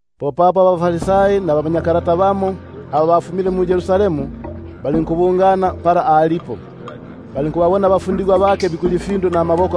Popapo abaFarisai nabamanyakalata bamo, aba bafumile mu-Yerusalemu, balinkubungana papo ali. Bo bagile ukuti abafundigwa bake bamo bikulya ifindu namaboko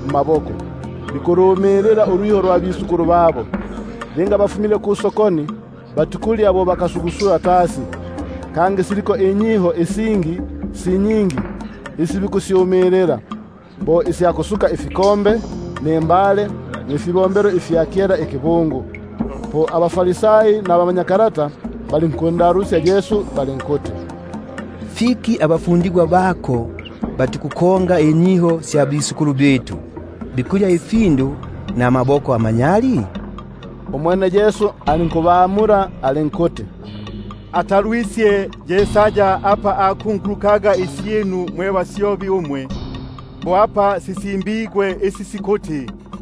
mmaboko, bikulumilila ulwiho lwa bakulumba babo; linga bafumile kusokoni, batikulya bo bakasugusula tasi, kangi siliko inyiho isingi si nyingi isi bikusyumilila, bo isya kusuka ifinwelo, nimbale, nifibombelo ifya kikuba). Popapo abaFarisai nabamanyakalata balinkundalusya balinkuti: Fiki abafundigwa bako batikukonga inyiho sya bakulumba, bikulya ifindu namaboko amanyali? Umwene alinkubamula alinkuti: Atalwisye Yesaya apa akungulukaga isyinu mwe basyobi umwe, bo apa sisimbigwe isi sikuti: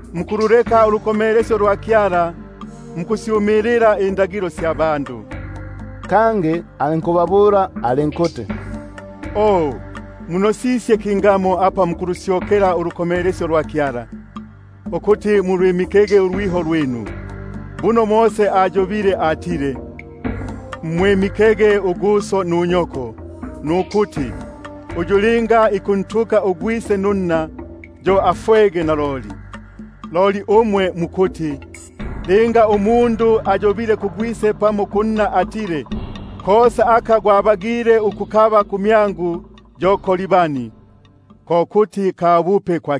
Mukululeka ulukomelesyo lwa Kyala, mukusyumilila inyiho sya bandu. Kangi alinkubabula alinkuti: O, munosisye kingamo apa mukulusyokela ulukomelesyo lwa Kyala, ukuti mulwimikege ulwiho lwinu! Buno Mose ayobile ukuti: Mwimike uguso nunyoko, nukuti: Uyu linga ikuntuka ugwise nunna, yo fikuti afwege naloli. Umwe loli mukuti: Linga umundu ayobile kugwise pamo kunna atile: Kosa aka gwabagile ukukaba kumyangu yo “Korbani”, ko kuti ka bupe kwa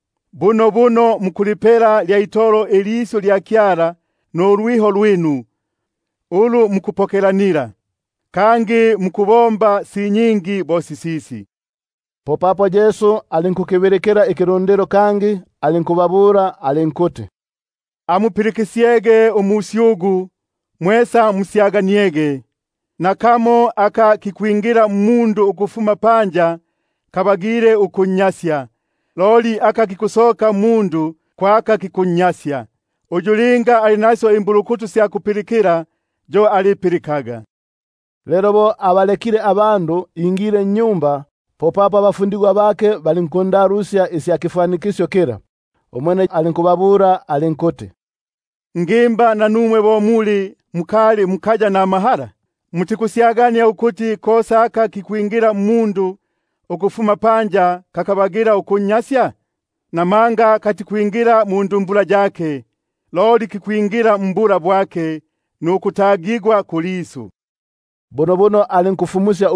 Bunobuno mukulipela lya itolo ilisyu lya Kyala nulwiho lwinu, ulu mukupokelanila; kangi mukubomba si nyingi bo sisisi. Umwene alinkukibilikila ikilundilo kangi, alinkubabula alinkuti: Amupilikisyege kumyangu, mwesa musyaganiege. Nakamo aka kikwingila mmundu ukufuma panja kabagile ukunnyasya, himma, loli aka kikusoka mmundu ko aka kikunnyasya. Uyu linga ali nasyo imbulukutu sya kupilikila yo alipilikaga. Lelo bo abalekile abandu ingile nnyumba, popapo abafundigwa bake balinkundalusya isya kifwanikisyo kila. Umwene alinkubabula alinkuti: Ngimba nanumwe bo muli bunobuno mukali amahala? Mutikusyagania ukuti kosa aka kikwingila mmundu ukufuma panja kakabagila ukunnya- sya? Papo katikwingila mundumbula yake, loli kikwingila mbula bwake nukutagigwa kulisu; bunobuno alinkufyelusya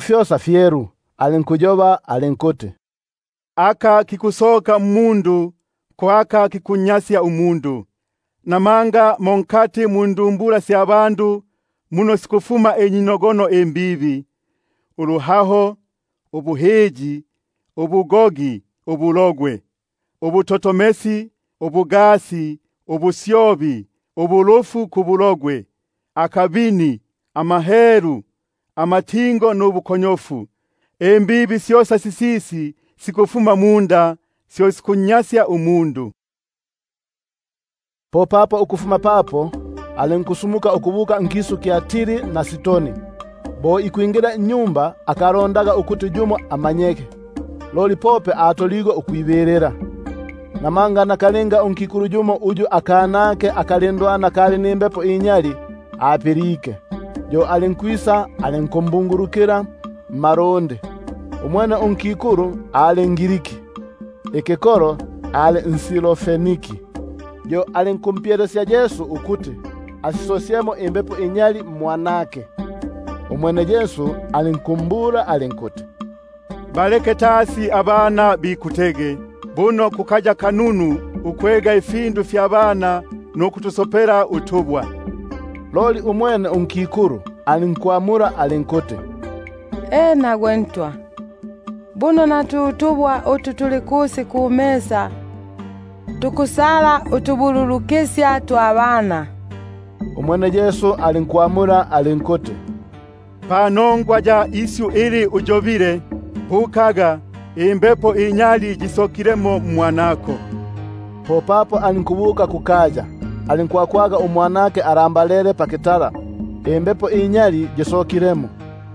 fyosa ifindu. Alinkuti: Aka lukusoka mmundu ko aka kikunnyasya umundu. Papo mo nkati mundumbula sya bandu muno sikufuma inyinogono imbibi, ubuhahani, ubu- hiyi, ubugogi, ubulogwe, ulutotomelo, ubugasi, ubusyobi, ubulufu kubulogwe, akabini, amahelu, amatingo nubu- konyofu. Syosa imbibi sisisi sikufuma munda, syo sikunnyasya umundu. Popapo alinkufuma papo, alinkusumuka ukubuka nkisu kya Tiri na Sidoni. Bo ikwingila nnyumba, akalondaga ukuti yumo amanyege. Loli akabagile ukwibilila, namanga unkikulu yumo, uyu akanake akalindwana kali nimbepo inyali, apilike, yo alinkwisa alinkumbungulukila mmalundi. Umwene unkikulu ali nGriki, ikikolo ali nSirofeniki; yo alinkumpye- lesya ukuti ayisosyemo imbepo inyali mmwanake. Umwene alinkumbula alinkuti: Baleke tasi abana bikutege, buno kukaya kununu ukwega ifindu fya bana nukutusopela utubwa. Unkikulu alinkwamula alinkuti: Ena Malafyale, buno na tu tubwa utu tuli kusi kukitalati tukusala utubululukisya twa bana. Umwene alinkwamula alinkuti: Panongwa ya isyu ili, bukaga, imbepo inyali yisokilemo mmwanako. Popapo alinkubuka kukaya, alinkwakwaga umwanake alambalele pakitala, nimbepo inyali yisokilemo.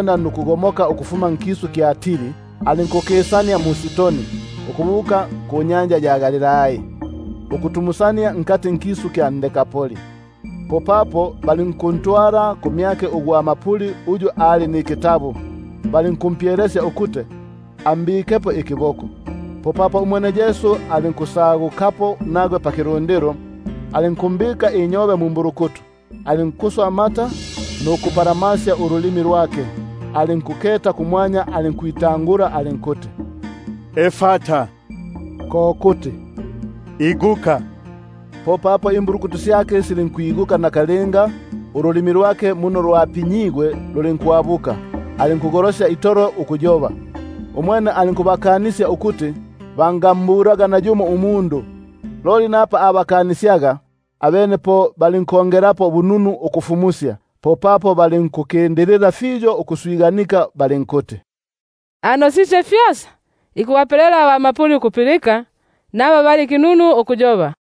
Alinkugomoka ukufuma nkisu kya Tiri, alinkukisania mu-Sidoni ukubuka kunyanja ya Galilai, ukutumusania nkati nkisu kya Dekapoli. Popapo balinkuntwala kumyake ugwa mapuli uyu ali nikitabu, balinkumpyelesya ukuti ambikepo ikiboko. Po umwene alinkusagukapo nagwe pakilundilo, alinkumbika inyobe mumbulukutu, alinkuswa amata nuku- mpalamasya ululimi lwake; alinkuketa kumwanya, alinkwita- ngula alinkuti: Efata, ko kuti iguka. Popapo imbulukutu syake silinkwiguka, nakalinga ululimi lwake muno lwapinyigwe lulinkwabuka, alinkugolosya itolo ukuyoba. Umwene; alinkukanisya ukuti bangambulaga nayumo umundu; loli napa abakanisyaga, abene po balinkongelapo bununu ukusifu- musya. Popapo balinkukindilila itolo ukuswiganika balinkuti: Anosisye fyosa, ikubapelela abamapuli ukupilika, nabakinunu ukuyoba.